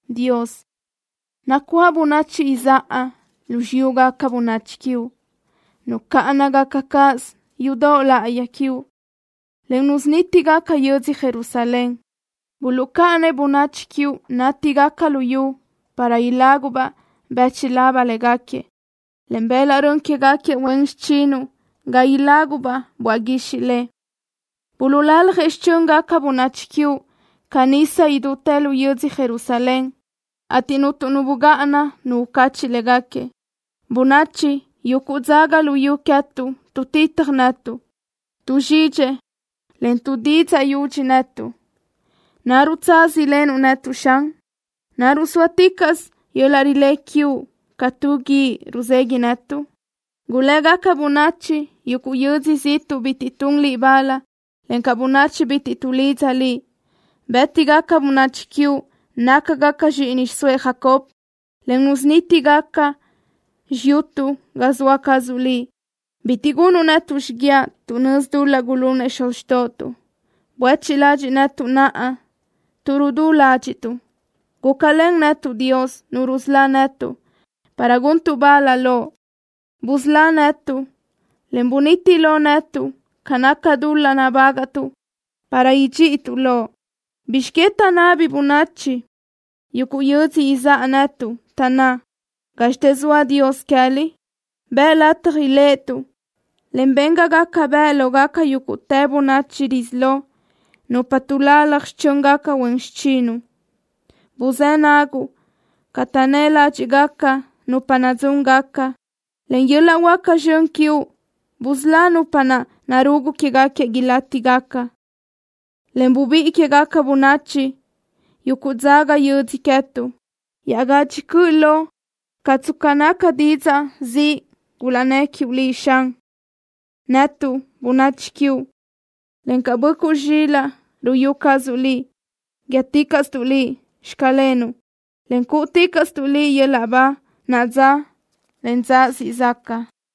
Dios, nacuáʼ bönachi izáʼa lu xiyúgaca bönachi quiuʼ. Nucáʼanagaca cáʼasö yudoʼ láʼayi quiuʼ, en nusunítigaca yödzö Jerusalén. Buluʼcáʼanëʼ bönachi quiuʼ nátigaca luyú para ilágubaʼ bíchulab léguequi, en bëlaʼ rön quégaca huen xichinuʼ ga ilágubaʼ böaʼ guixiʼ le. Buluʼlaljëʼ xichö́ngaca bönachi quiuʼ ca nisa idútë lu yödzö Jerusalén, ateʼ cuntu nu bugáʼana nu ucacheʼ léguequi. Bönachi yuguʼ dzaga luyú queë́tuʼ tuʼtitaj netuʼ. Tuʼzxidxëʼ, en tuʼdidzaʼ yudxi netuʼ. ¿Naruʼ tsaz ilenuʼ netuʼ, Xan? ¿Naruʼ sóaticaʼsö yöl-laʼ rilé quiuʼ ca tu guíʼ ruzegui netuʼ? Gulégaca bönachi yuguʼ yödzö ziʼtuʼ bitiʼ tun Liʼ bal, encaʼ bönachi bitiʼ tuʼlidza Liʼ. Bë́tigaca bönachi quiuʼ nácagaca zxíʼini xiʼsóëʼ Jacob, en nusunítigaca xiyutuʼ ga zoa cazuʼ Liʼ. Bitiʼ gunuʼ netuʼ xiguiaʼ tuʼ nözi dul-laʼ gulunëʼ xuz xtóʼotuʼ. Buéchiʼ ladxiʼ netuʼ naʼa, tuʼ rudú ládxiʼtuʼ. Gúcalen netuʼ, Dios, Nu rusölá netuʼ, para guntuʼ bal Loʼ. Busölá netuʼ, en buniti lo netuʼ ca naca dul-laʼ nabágaʼtuʼ para idxíʼituʼ Loʼ. ¿Bizx que taʼnabi bönachi yuguʼ yödzö izáʼa netuʼ, taʼnná: “Gázxitë zoa Dios queë́liʼ”? Bëʼ lataj iléʼetuʼ, en ben ga gaca bëʼ lógaca yúguʼtë bönachi rizíʼ loʼ nupa tuʼlalaj xichö́ngaca huen xichinuʼ. Buzë́ naguʼ ca taʼnnë́ ládxiʼgaca nupa nadzúngaca. Len yöl-laʼ huáca zxön quiuʼ busölá nupa naʼ narugu quéguequi ilátigaca, en bubíʼi quégaca bönachi yuguʼ dzaga yödzö queë́tuʼ iaʼgadxi cöʼlö caʼ tsca naca didzaʼ ziʼ gulaʼnnë́ quiuʼ Liʼ, Xan. Netuʼ, bönachi quiuʼ, encaʼ böʼcuʼ zxilaʼ ruyú cazuʼ Liʼ, guíëticaʼstuʼ Liʼ: “Xclenuʼ”, en cúʼuticaʼstuʼ Liʼ yöl-laʼ ba naʼa dza, en dza siʼ zaca.